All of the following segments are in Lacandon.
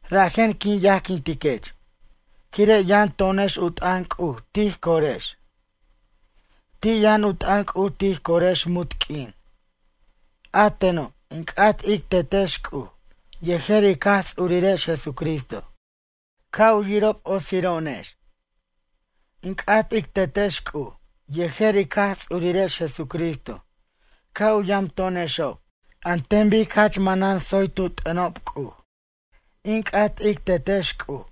Rajen quin yajquintiquech, quire' yʌn to'onex u t'ʌn C'uj tij corex. Ti' yʌn u t'ʌn C'uj tij corex munt q'uin. A teno' in c'at ic Tetex C'uj yejer ic Jaj Ts'urirex Jesucristo ca' u yirob otsiro'onex. In c'at ic Tetex C'uj yejer ic Jaj Ts'urirex Jesucristo ca' u yamto'onexob an ten bic jach manan tsoy tu t'ʌnob C'uj. In c'at ic Tetex C'uj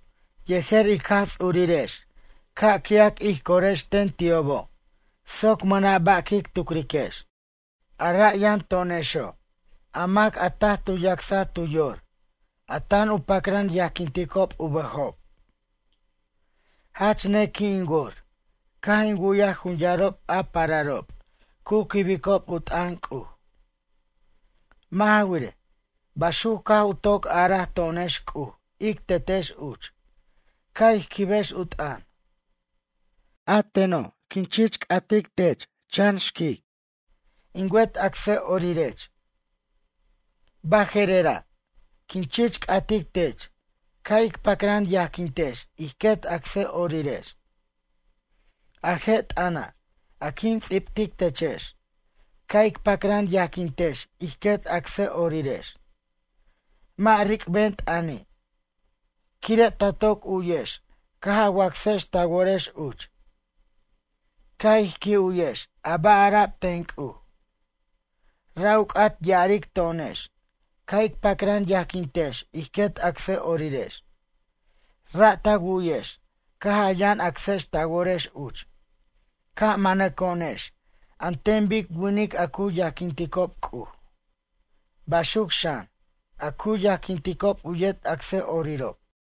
yejer ic Jaj Ts'urirex ca' qui'ac ij corex ten ti'obo' soc mʌna' ba' quic tucriquex. A ra' yʌn to'onexo' a mac a taj tu yacsaj tu yor a tan u pacran yajquinticob u bʌjob. Jach nequi' in wor caj in wu'yaj jun yarob a pararob cu quibicob u t'ʌn C'uj. Mʌ' ja wirej, baxuc caj u toc araj to'onex C'uj ic Tetex uch, ca' ij quibex u t'ʌn. A teno', quin chich c'atic tech chan xquic, in wet acsʌ'orirech. Baje'rera', quin chich c'atic tech ca' ic pacran yajquintex ij quet acsʌ'orirex. A je' t'ʌna', a quin ts'ibtic techex, ca' ic pacran yajquintex ij quet acsʌ'orirex. Mʌ' ric'ben t'ʌni', quire' ta toc u'yex caj a wacsex ta worex uch. Ca' ij qui' u'yex a ba' ara'b ten C'uj. Ra' u c'at ya'aric to'onex, ca' ic pacran yajquintex ij quet acsʌ'orirex. Ra' ta wu'yex caj a yʌn acsex ta worex uch ca' manaco'onex an ten bic winic a cu yajquinticob C'uj, baxuc xan, a cu yajquinticob u yet acsʌ'orirob.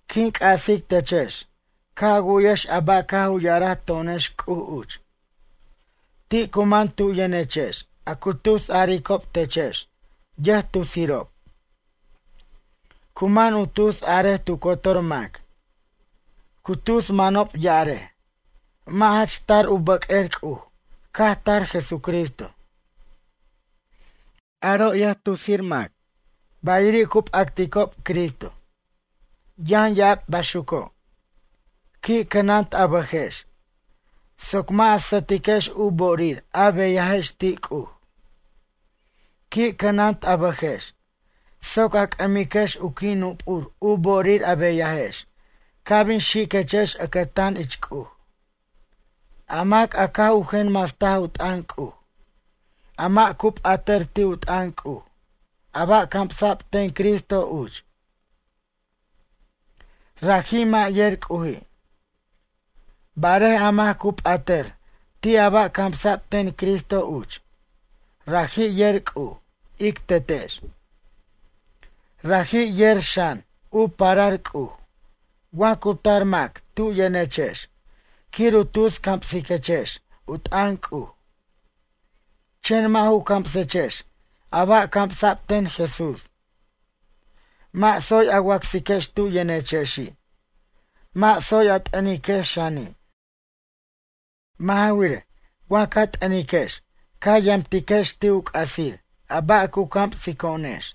Quin c'asic techex ca' a wu'yex a ba' caj u ya'araj to'onex C'uj uch. Ti' cu man tu yʌnechex a cu tus aricob techex, yʌjtusirob. Cu man u tus a'arej tu cotor mac. Cu tus manob ya'arej: “Mʌ' jach tar u bʌq'uer C'uj caj tar Jesucristo.” Aro' yʌjtusir mac, bayiri' cu p'acticob Cristo. Yʌn ya'ab baxuco'. Qui' cʌnant a bʌjex soc mʌ' a sʌtiquex u bo'orir a beyajex ti' C'uj. Qui' cʌnant a bʌjex soc a c'ʌmiquex u qui' nup'ur u bo'orir a beyajex ca' bin xiquechex ʌcʌtan ich C'uj. A mac a caj u jenmastaj u t'ʌn C'uj a mʌ' cu p'atʌr ti' u t'ʌn C'uj a ba' camsa'b ten Cristo uch. Raji' mʌ' yer C'uji'. Barej a mac cu p'atʌr ti' a ba' camsa'b ten Cristo uch. Raji' yer C'uj, ic Tetex. Raji' yer xan u parar C'uj. Wa cu tar mac tu yʌnechex quir u tus camsiquechex u t'ʌn C'uj. Chen mʌ' ju camsechex a ba' camsa'b ten Jesús. Mʌ' tsoy a wacsiquex tu yʌnechexi' mʌ' tsoy a t'ʌniquex xani'. Mʌ' ja wirej, wa ca t'ʌniquex ca yamtiquex ti' u c'asir a ba' cu camsico'onex.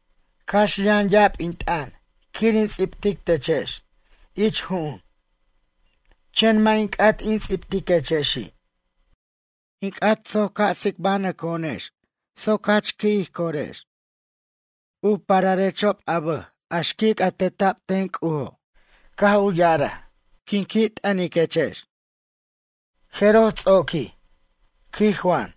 Cax yʌn ya'ab in t'ʌn quir in ts'ibtic techex ich ju'un. Chen mʌ' in c'at in ts'ibtiquechexi'. In c'at soc ca' tsicbanʌco'onex soc jach qui' ij corex. U pararexob a bʌj a xquic a teta'b ten C'ujo' caj u ya'araj: “In qui' t'ʌniquechex.” Jeroj ts'oquij, quij Juan.